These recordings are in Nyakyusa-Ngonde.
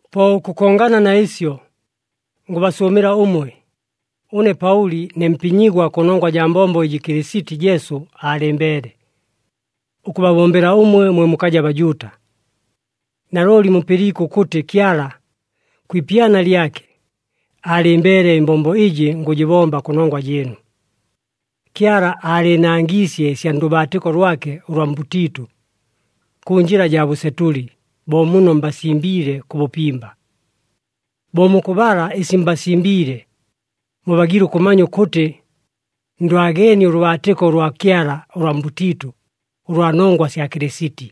Po ʉkʉkongana na ɨsyo, ngʉbasʉʉmɨla ʉmwe, ʉne Paʉli ne mpinyigwa kʉnongwa jaa mbombo ɨjɨ Kɨlɨsiti Jesu aalɨmbeele, ʉkʉbabombela ʉmwe mwe mukaja Bajuuta. Nalooli mupɨliike ʉkʉtɨ Kyala, kwi ipyana lyake, aalɨmbeele ɨmbombo ɨjɨ ngʉjɨbomba kʉnongwa jɨɨnu. Kyala aalɨɨnangiisye ɨsya ndʉbaatɨko lwake ʉlwa mbʉtiitʉ, kʉ njɨla jaa bʉsetʉli, bo muno mbasimbiile kʉ bʉpimba. Bo mukʉbala ɨsi mbasimbiile, mubagiile ʉkʉmanya ʉkʉtɨ, ndwageenie ʉlʉbaatɨko ʉlwa Kyala ʉlwa mbʉtiitʉ, ʉlwa nongwa sya Kɨlɨsiti.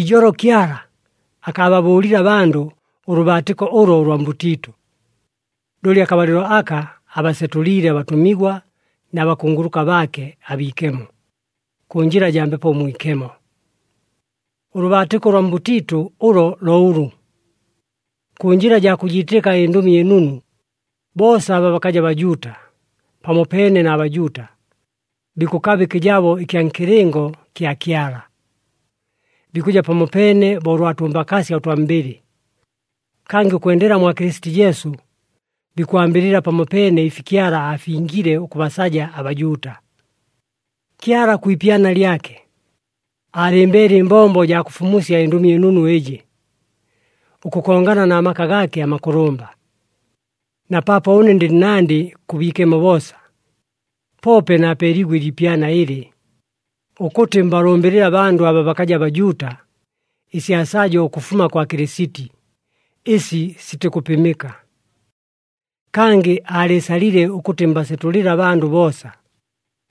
Ijolo Kyala akaababʉʉlile abandʉ ʉlʉbaatɨko ʉlo ʉlwa mbʉtiitʉ. Looli akabalɨlo aka abasetʉliile abatʉmigwa na bakunguluka baake abiikemo, kʉ njɨla jaa Mbepo Mwikemo. Ʉlʉbaatɨko ʉlwa mbʉtiitʉ ʉlo lo ʉlʉ. Kʉ njɨla jaa kʉjiitɨka ɨNdʉmi ɨNunu, boosa aba bakaja Bajuuta, pamopeene na Bajuuta, bikʉkaba ɨkɨjabo ɨkya nkɨlɨngo kya Kyala. Bikʉja pamopeene bo ʉlwa tʉmbakaasya ʉtwa mbɨlɨ. Kangɨ ʉkwendela mwa Kɨlɨsiti Jesu, bikwambɨlɨla pamopeene ɨfi Kyala aafingile ʉkʉbasaja aBajuuta. Kyala kwi ipyana lyake, aalɨmbeele ɨmbombo jaa kʉfumusya ɨNdʉmi ɨNunu ɨjɨ, ʉkʉkongana na maka gaake amakʉlʉmba. Na paapo ʉne ndɨ nnandɨ kʉ biikemo boosa, poope naapeeliigwe ɨliipyana ɨlɨ, ʉkʉtɨ mbalʉmbɨlɨle abandʉ aba bakaja Bajuuta ɨsya sajo ʉkʉfuma kwa Kɨlɨsiti, ɨsi sitikʉpɨmɨka. Kangɨ aalɨɨsalile ʉkʉtɨ mbasetʉlɨle abandʉ boosa,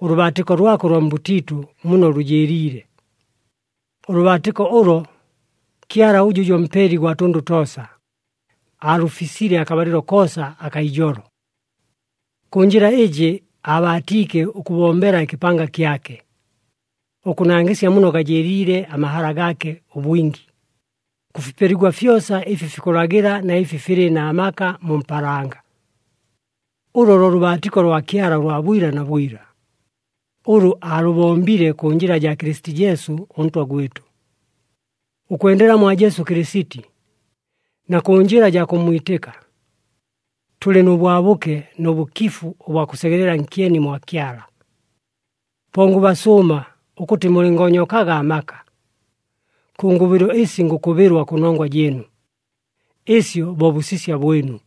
ʉlʉbaatɨko lwake ʉlwa mbʉtiitʉ muno lʉjɨɨliile. Ʉlʉbaatɨko ʉlo, Kyala ʉjʉ jo Mpeli gwa tʉndʉ toosa, aalʉfisile akabalɨlo koosa akaa ijolo. Kʉ njɨla ɨjɨ aabaatiike ʉkʉbombela ɨkɨpanga kyake, ʉkʉnangɨsya muno gajɨɨliile amahala gaake ʉbwingi, kʉ fipeligwa fyosa ɨfi fikʉlagɨla na ɨfi filɨ na maka mu mpaalanga. Ʉlo lo lʉbaatɨko lwa Kyala ʉlwa bwila na bwila, ʉlʉ aalʉbombile kʉ njɨla jaa Kɨlɨsiti Jesu ʉNtwa gwɨtʉ. Ʉkwendela mwa Jesu Kɨlɨsiti na kʉ njɨla jaa kʉmmwitɨka, tʉlɨ nʉ bwabʉke nʉ bʉkifu ʉbwa kʉsegelela nkyeni mwa Kyala. Po ngʉbasʉʉma ʉkʉtɨ mulɨngoonyokaga amaka. Kʉ ngʉbɨlo ɨsi ngʉkʉbɨlwa kʉnongwa jɨɨnu, ɨsyo bo bʉsisya bwɨnu.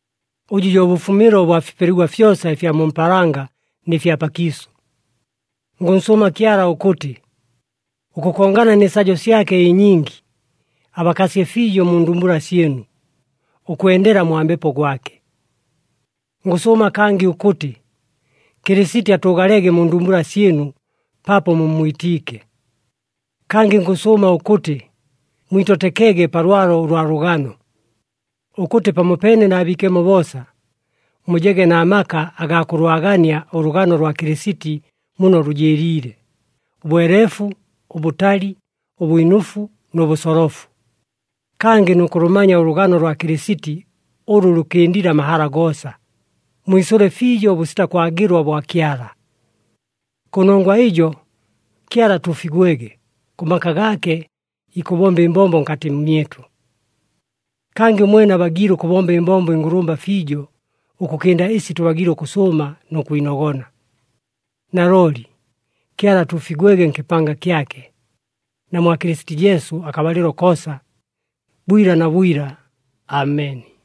ʉjʉ jo bʉfumɨlo ʉbwa fipeligwa fyosa ɨfya mu mpaalanga nɨ fya pakiisʉ. Ngʉnsʉʉma Kyala ʉkʉtɨ, ʉkʉkongana nɨ sajo syake ɨnyingi, abakasye fiijo mu ndumbula syɨnu, ʉkwendela mwa Mbepo gwake. Ngʉsʉʉma kangɨ ʉkʉtɨ, Kɨlɨsiti atʉʉgalege mu ndumbula syɨnu paapo mummwitiike. Kangɨ ngʉsʉʉma ʉkʉtɨ mwitotekege pa lwalo ʉlwa lʉgano, ʉkʉtɨ pamopeene na biikemo boosa, mujege na maka agaa kʉlwagania ʉlʉgano lwa Kɨlɨsiti muno lʉjɨɨliile, ʉbweleefu, ʉbʉtali, ʉbwinʉfu nʉ bʉsolofu. Kangɨ nʉ kʉlʉmanya ʉlʉgano lwa Kɨlɨsiti ʉlʉ lʉkɨndile amahala goosa, mwisʉle fiijo ʉbʉsita kwagɨlwa bwa Kyala. Kʉnongwa ɨjo Kyala atuufigwege! Kʉ maka gaake ikʉbomba ɨmbombo nkatɨ mmyɨtʉ. Kangɨ ʉmwene abagiile ʉkʉbomba ɨmbombo ɨngʉlʉmba fiijo ʉkʉkɨnda ɨsi tʉbagiile ʉkʉsʉʉma nʉ kwinogona. Nalooli Kyala atuufigwege nkɨpanga kyake, na mwa Kɨlɨsiti Jesu akabalɨlo koosa, bwila na bwila! Ameni.